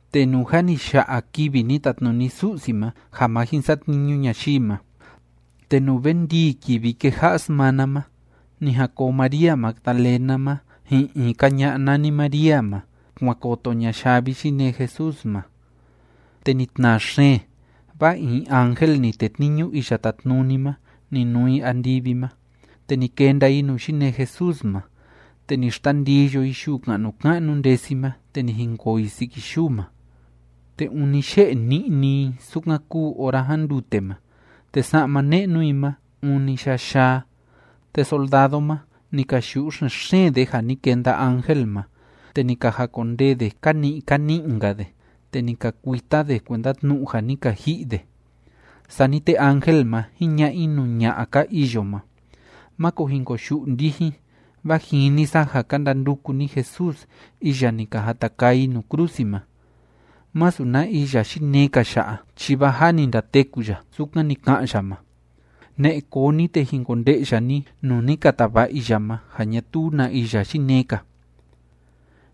Te nuu jâ ni ya'a kivi ni tatnuni Su'si ma ja ma jin satniñu ñayii ma, te nuu ve ndii kivi kéja'a smana ma, ni jan koo María Magdalena ma, ji'in in‑ka ña'a nani María ma, kuan koto ña yavi yinee Jesús ma. Te ni tnaa xeen, vaa in ángel ni tetniñu Iya Tátnuni ma, ni nuu i andivi ma, te ni kenda i nuu yinee Jesús ma, te ni xtandiyo i yuu ka'nu ka'nu ndesi ma, te ni jinkoo i siki yuu ma. Te ûni ye'e ni'ni i sukan kúu ora jándute ma. Te sa'ma ne'nu i ma, ûni yayaa. Te soldado ma, ni ka yu'u xen‑xeen de ja ni kenda ángel ma, te ni ka jakondee de ka ni'i ka ni'i‑nka de, te ni ka kuita de, kuenda tnu'u ja ni ka ji'i de. Sani te ángel ma, jiña'a i nuu ña'a ka iyo ma: ―Máko jin koyu'u ndijin, vaa jini sa ja ka ndanduku ni Jesús iya ni ka jata kaa i nuu krusi ma. Masu na iya yinee‑ka ya'a, chi vaa jâ ni ndateku ya, sukan ni ka'an ya ma. Ne'e koo ni, te jin konde'ya ni nuu ni ka tava'a i ya ma, ja ñatuu na iya yinee‑ka.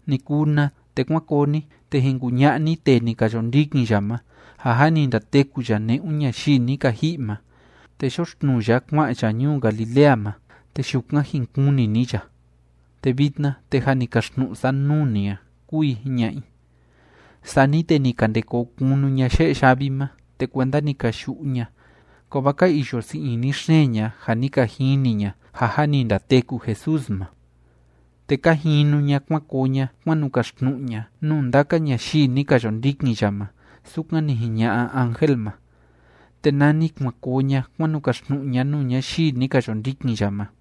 Ni kuu na, te kuán koo ni, te jin kuña'a ni tee ni ka yo ndikin ya ma, ja jâ ni ndateku ya ne'un ñayii ni ka ji'i ma, te yoxtnuu ya kua'an ya ñuu Galilea ma. Te yukan jin kuni ni ya. Te vitna, te jâ ni kaxtnu'u sa nuu ni a ―kúu i jiña'a i. Sani te ni ka nde koo kunu ña ye'e yavi ma, te kuenda ni ka yu'u ña, kovaa ka iyo sii ini xeen ña ja ni ka jini ña ja jâ ni ndateku Jesús ma. Te ka jinu ña kuan koo ña kuan nu kaxtnu'u ña nuu ndaka ñayii ni ka yo ndikin ya ma sukan ni jiña'a ángel ma. Te nani kuan koo ña kuan nu kaxtnu'u ña nuu ñayii ni ka yo ndikin ya ma,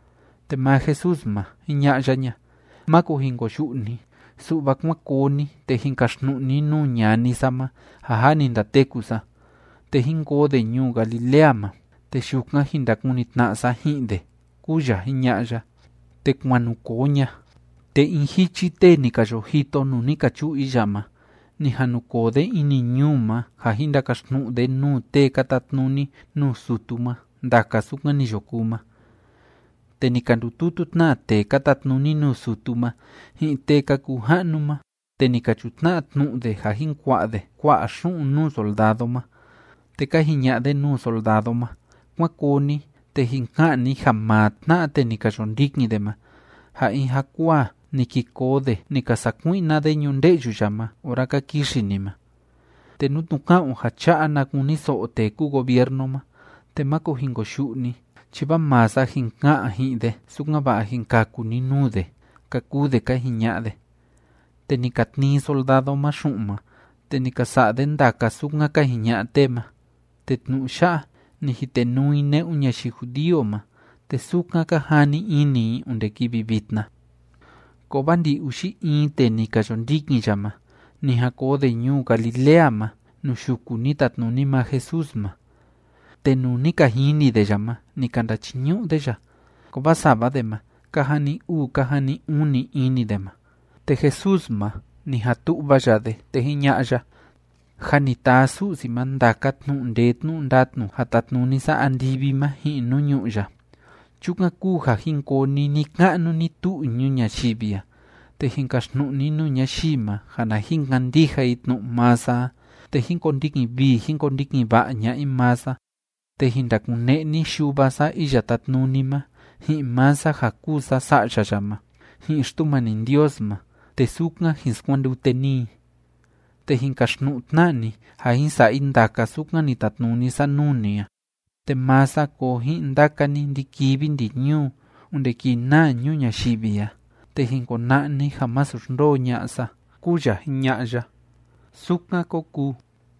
Te maa Jesús ma, jiña'a ya ña: ―Máko jin koyu'u ni, su'va kuán koo ni, te jin kaxtnu'u ni nuu ñani sa ma ja jâ ni ndateku sa, te jín koo de ñuu Galilea ma, te yukan jin ndakuni tna'a sa ji'in de ―kúu ya jiña'a ya. Te kuan nu koo ña, te in jichi tee ni ka yo jito nuu ni ka chu'u i ya ma, ni jan nu koo de ini ñuu ma ja jin ndakaxtnu'u de nuu tee ka tatnuni nuu sutu ma ndaka sukan ni yo kuu ma. Te ni ka ndututu tna tee ka tatnuni nuu sutu ma, ji'in tee ka kuu ja'nu ma, te ni ka chutna'a tnu'u de ja jin kua'a de kua'a xu'un nuu soldado ma, te ka jiña'a de nuu soldado ma: ―Kuán koo ni, te jin ka'an ni ja maa tna'a tee ni ka yo ndikin de ma, ja in jakuaa ni ki koo de ni ka sakui'na de ñunde'yu ma ora ka kixi ni ma. Te nú tnu'u ka'an o ja cha'a na kuniso'o tee kúu gobiernu ma, te máko jin koyu'u ni, chi vaa maa sa jin ka'an ji'in de, sukan‑va'a jin kaku ni nuu de ―ka kuu de ka jiña'a de. Te ni ka tnii soldado ma xu'un ma, te ni ka sa'a de ndaka sukan ka jiña'a tee ma. Te tnu'u ya'a, ni jitenuu i ne'un ñayii judío ma, te sukan ka jani ini i onde kivi vitna. Kovaa ndi‑uxi in tee ni ka yo ndikin ya ma, ni jan koo de ñuu Galilea ma, nuu yuku ni tatnuni maa Jesús ma. Te nuu ni ka jini de ya ma, ni ka ndachiñu'u de ya, kovaa sava de ma, ka jani uu ka jani uni ini de ma. Te Jesús ma, ni jan tu'va ya de, te jiña'a ya: ―Jâ ni taa Su'si ma ndaka tnu'u ndee tnu'u ndatnu ja tátnuni sa andivi ma ji'in nuu ñu'ú ya. Chukan kúu ja jin koo ni ni‑ka'nu ni‑tu'u ñuu ñayivi a, te jin kaxtnu'u ni nuu ñayii ma ja na jin kandija i tnu'u maa sa a te jín kondikin vii jín kondikin va'a ña'a i maa sa, te jin ndakune'e ni Yuva sa Iya Tátnuni ma, ji'in maa sa ja kúu sa Sa'ya ya ma, ji'in Xtumani Ndios ma, te sukan jin skuandute ni i. Te jin kaxtnu'u tna ni ja jin sa'a i ndaka sukan ni tatnuni sa nuu ni a, te maa sa koo ji'in ndaka ni ndi‑kivi ndi‑ñuu onde kii naa ñuu ñayivi a, te jin kona'a ni ja masu xndoo ña'a sa ―kúu ya jiña'a ya. Sukan kó kuu.